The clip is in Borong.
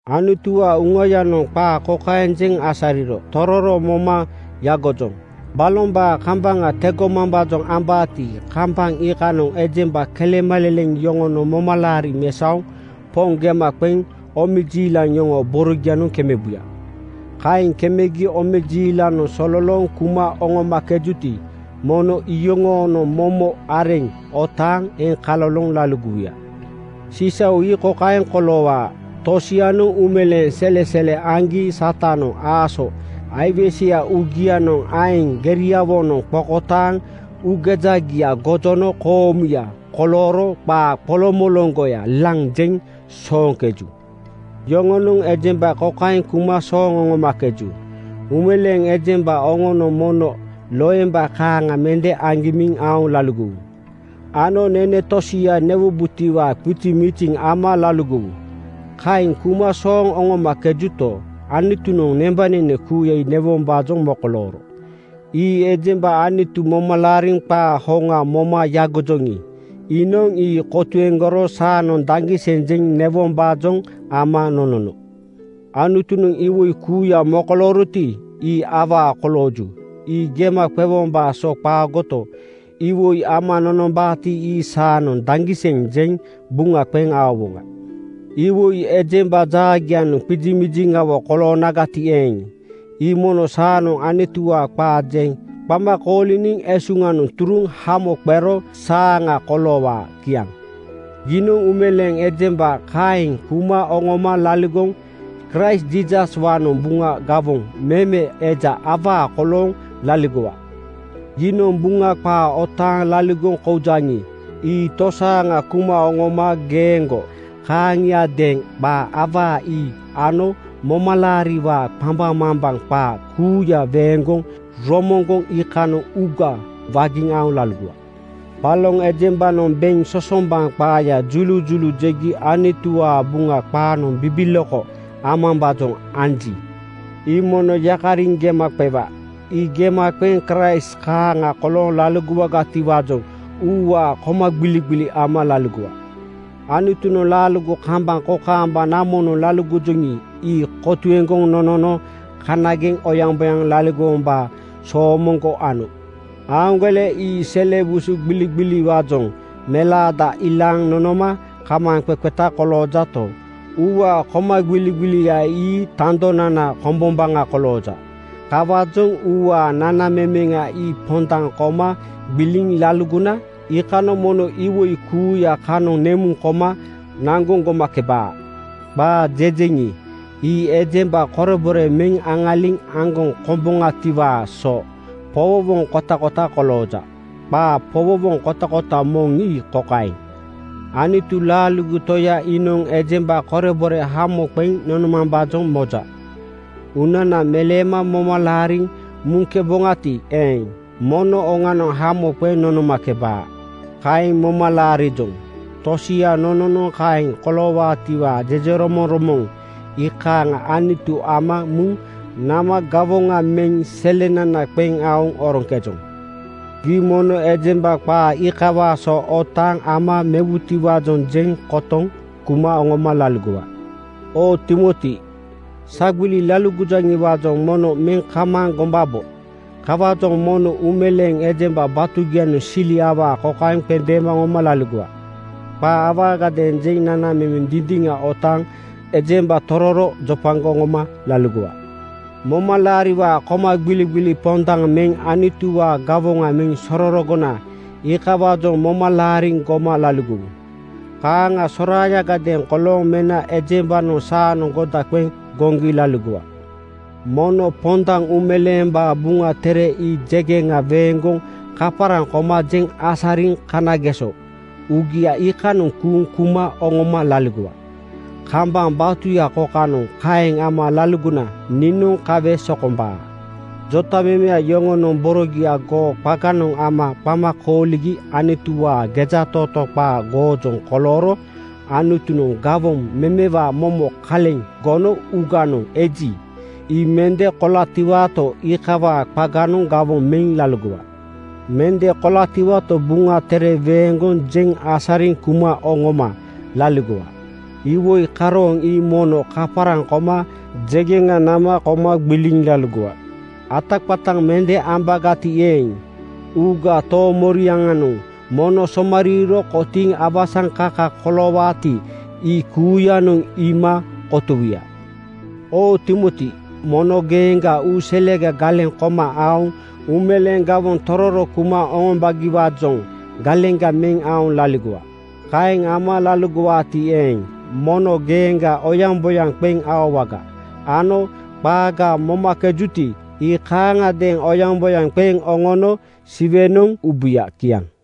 Anutuwaa Uŋayanoŋ qaa kokaeŋ jeŋ asariro tororo moma yagojoŋ: Balombaa kambaŋa tegomambaajoŋ ambaati, kambaŋ iikanoŋ ejemba kelemaleleŋ yoŋonoŋ momalaari mesaoŋ Poŋ gema qeŋ omejiilaŋ yoŋoo borogianoŋ kemebuya. Kaeŋ kemegi omejiilanoŋ sololooŋ kuma oŋomakejuti, mono iyoŋoonoŋ momo areŋ otaaŋ eŋkaloloŋ laligowuya. Sisau ii kokaeŋ koloowaa: Tosianoŋ uumeleeŋ selesele aŋgi Satanoŋ aaso aiweseya uugianoŋ aeŋ geriawonoŋ qokotaaŋ uugejagia gojono koomuya kolooro qaa qoloŋmoloŋgoya laŋ jeŋ sooŋkeju. Yoŋonoŋ ejemba kokaeŋ kuma sooŋ oŋomakeju, ‘Uumeleeŋ ejemba oŋonoŋ mono loemba kaaŋa mende agimiŋ aoŋ laligowu ano nene tosia newubotiwaa qizimiziŋ ama laligowu.’ Kaeŋ kuma sooŋ oŋomakejuto, Anutunoŋ nembanene kuuya ii newombaajoŋ mokolooro. Ii ejemba Anutu moma laariŋ qaa hoŋa moma yagojoŋi, iinoŋ ii kotuegoro saanoŋ daŋgiseŋ jeŋ newom-baajoŋ ama nonono. Anutunoŋ iwoi kuuya mokolooroti, ii awaa kolooju. Ii gema qewombaa so qaagoto, iwoi ama nonombaati, ii saanoŋ daŋgiseŋ jeŋ buŋa qeŋ aowoŋa. Iwoi ejemba jaagianoŋ qizimiziŋawo koloonagati eeŋ, ii mono saanoŋ Anutuwaa qaa jeŋ qama kooliniŋ esuŋanoŋ turuŋ hamo qero saaŋa koloowaa. Kiaŋ. Giinoŋ uumeleeŋ ejemba kaeŋ kuma oŋoma laligoŋ Kraist Jiisaswaanoŋ Buŋa gawoŋ meme eja awaa kolooŋ laligowa. Giinoŋ Buŋa qaa otaaŋ laligoŋ koujaŋi, ii tosaaŋa kuma oŋoma geeŋgo kaaŋiadeeŋ qaa awaa ii ano momalaariwaa qambaŋmambaŋ qaa kuuya weeŋgoŋ romoŋgoŋ iikanoŋ uuga wagiŋ aoŋ laligowa. Baloŋ ejembanoŋ beŋ sosombaŋ qaaya julujulu jegi Anutuwaa Buŋa qaanoŋ bibiloko amambaajoŋ anji, ii mono yakariŋ gema qewa. Ii gema qeŋ Kraist kaaŋa kolooŋ laligowagatiwaajoŋ uuwaa komagbiligbili ama laligowa. Anutunoŋ laaligo kambaŋ kokaamba namonoŋ laligojoŋi, ii kotuegoŋ nonono kanageŋ oyaŋboyaŋ laligowombaa soomoŋgo ano. Aaŋgole ii sele busu gbiligbiliwaajoŋ melaada ilaaŋ nonoma kamaaŋqeqeta koloojato, uuwaa komagbiligbilia ii tandonana komboŋa kolooja. Kawaajoŋ uuwaa nanamemeŋa ii pondaŋ koma gbiliŋ laligona iikanoŋ mono iwoi kuuya kanoŋ nemuŋ koma naŋgoŋ gomakebaa. Qaa jejeŋi, ii ejemba korebore meŋ aŋaliŋ aŋgoŋ komboŋatiwaa so powowoŋ kotakota kolooja. Qaa powowoŋ kotakota moŋ ii kokaeŋ: “Anutu laaligo Toya iinoŋ ejemba korebore hamo qeŋ nonomambaajoŋ moja. Uunana meleema moma laariŋ muŋkeboŋati eeŋ, mono oŋanoŋ hamo qeŋ nonomakebaa. Kaeŋ moma laarijoŋ. Tosia nononoŋ kaeŋ koloowaatiwaa jejeromoŋromoŋ iikaaŋa Anutu ama muŋ nama gawoŋa meŋ selenana qeŋ aoŋ oroŋkejoŋ.” Gii mono ejemba qaa iikawaa so otaaŋ ama mewutiwaajoŋ jeŋ kotoŋ kuma oŋoma laligowa. Oo Timoti, sagbili laligojaŋiwaajoŋ moŋnoŋ meŋ kamaaŋ gombabo. Kawaajoŋ mono uumeleeŋ ejemba batugianoŋ sili awaa kokaeŋ qendeema oŋoma laligowa: Qaa awaagadeeŋ jeŋ nanamemeŋ dindiŋa otaaŋ ejemba tororo jopagoŋ oŋoma laligowa. Momalaariwaa komagbiligbili pondaŋ meŋ Anutuwaa gawoŋa meŋ sororogona iikawaajoŋ moma laariŋ goma laligowu. Kaaŋa soraayagadeeŋ kolooŋ mena ejembanoŋ saanoŋ goda qeŋ goŋgi laligowa. Mono pondaŋ Uumeleembaa Buŋa Tere ii jegeŋa weeŋgoŋ kaparaŋ koma jeŋ asariŋ kanageso uugia iikanoŋ kuuŋ kuma oŋoma laligowa. Kambaŋ batuya kokanoŋ kaeŋ ama laligona niinoŋ kawe sokombaa. Jotamemeya yoŋonoŋ borogia goo qaganoŋ ama qama kooligi Anutuwaa gejatootoo qaa goojoŋ kolooro Anutunoŋ gawoŋ memewaa momo kaleŋ gono uuganoŋ eji, ii mende kolatiwato, iikawaa qaganoŋ gawoŋ meŋ laligowa. Mende kolatiwato, Buŋa Tere weeŋgoŋ jeŋ asariŋ kuma oŋoma laligowa. Iwoi karooŋ ii mono kaparaŋ koma jegeŋa nama koma gbiliŋ laligowa. Ataqataŋ mende ambagati eeŋ, uugaa toomoriaŋanoŋ mono somariiro kotiiŋ awasaŋkaka koloowaati, ii kuuyanoŋ iima kotowuya. Oo Timoti, mono geeŋgaa uu selega galeŋ koma aoŋ uumeleeŋ gawoŋ tororo kuma oŋombagiwaajoŋ galeŋga meŋ aoŋ laligowa. Kaeŋ ama laligowaati eeŋ, mono geeŋga oyaŋboyaŋ qeŋ aowaga ano qaaga momakejuti, ii kaaŋadeeŋ oyaŋboyaŋ qeŋ oŋona Siwenoŋ ubuya. Kiaŋ.